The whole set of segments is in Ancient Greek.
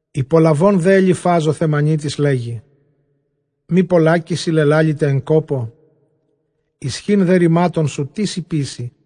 Ὑπολαβὼν δὲ Ἐλιφὰς ὁ Θαιμανίτης, λέγει, Μὴ πολλάκις σοι λελάληται ἐν κόπῳ; ἰσχὺν δὲ ῥημάτων σου τίς ὑποίσει;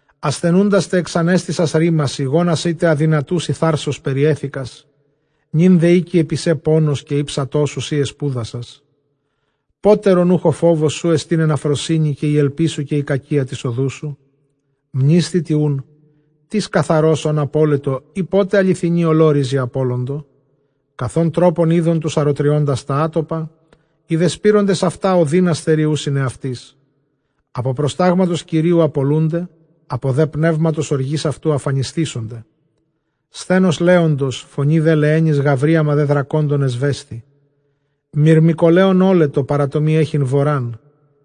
ἀσθενοῦντάς τε ἐξανέστησας ῥήμασι, γόνασί τε ἀδυνατοῦσι θάρσος περιέθηκας. Νῦν δὲ ἥκει ἐπὶ σὲ πόνος καὶ ἥψατό σου, σὺ ἐσπούδασας. Πότερον οὐχ ὁ φόβος σου ἐστὶν ἐν ἀφροσύνῃ, καὶ ἡ ἐλπίς σου καὶ ἡ κακία τῆς ὁδοῦ σου; Μνήσθητι οὖν, τίς καθαρὸς ὢν ἀπώλετο, ἢ πότε ἀληθινοὶ ὁλόῤῥιζοι ἀπώλοντο; Καθʼ ὃν τρόπον εἶδον τοὺς ἀροτριῶντας τὰ ἄτοπα, οἱ δὲ σπείροντες αὐτὰ ὀδύνας θεριοῦσιν ἑαυτοῖς. Ἀπὸ προστάγματος Κυρίου ἀπολοῦνται, ἀπὸ δὲ πνεύματος ὀργῆς αὐτοῦ ἀφανισθήσονται. Σθένος λέοντος, φωνὴ δὲ λεαίνης, γαυρίαμα δὲ δρακόντων ἐσβέσθη. Μυρμηκολέων ὤλετο παρὰ τὸ μὴ ἔχειν βορὰν,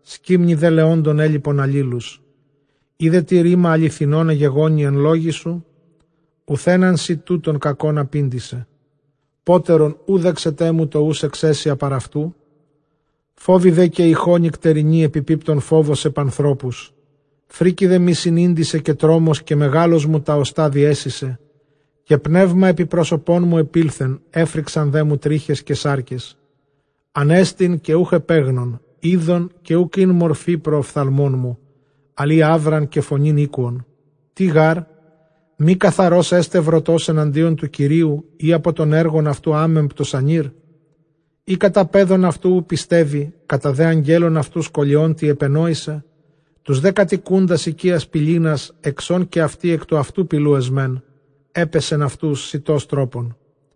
σκύμνοι δὲ λεόντων ἔλιπον ἀλλήλους. Εἰ δέ τι ῥῆμα ἀληθινὸν ἐγεγόνει ἐν λόγοις σου, οὐθὲν ἄν σοι τούτων κακὸν ἀπήντησε· πότερον οὐ δέξεταί μου τὸ οὖς ἐξαίσια παρʼ αὐτοῦ; Φόβῳ δὲ καὶ ἤχῳ νυκτερινῇ ἐπιπίπτων φόβος ἐπʼ ἀνθρώπους, φρίκη μοι συνήντησεν καὶ τρόμος, καὶ μεγάλως μου τὰ ὀστᾶ διέσεισε, καὶ πνεῦμα ἐπὶ πρόσωπόν μου ἐπῆλθεν, ἔφριξαν δέ μου τρίχες καὶ σάρκες. Ἀνέστην καὶ οὐκ ἐπέγνων, εἶδον καὶ οὐκ ἦν μορφὴ πρὸ ὀφθαλμῶν μου, ἀλλʼ ἢ αὖραν καὶ φωνὴν ἤκουον. Τί γάρ; μὴ καθαρὸς ἔσται βροτὸς ἐναντίον τοῦ Κυρίου; ἢ ἀπὸ τῶν ἔργων αὐτοῦ ἄμεμπτος ἀνήρ; Εἰ κατὰ παίδων αὐτοῦ οὐ πιστεύει, κατὰ δὲ ἀγγέλων αὐτοῦ σκολιόν τι ἐπενόησε. Τοὺς δὲ κατοικοῦντας οἰκίας πηλίνας, ἐξ ὧν καὶ αὐτοὶ ἐκ τοῦ αὐτοῦ πηλοῦ ἐσμεν, ἔπαισεν αὐτοὺς σητὸς τρόπον,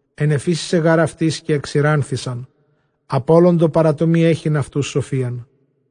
Ἐνεφύσησε γὰρ αὐτοῖς καὶ ἐξηράνθησαν, ἀπώλοντο παρὰ τὸ μὴ ἔχειν αὐτοὺς σοφίαν.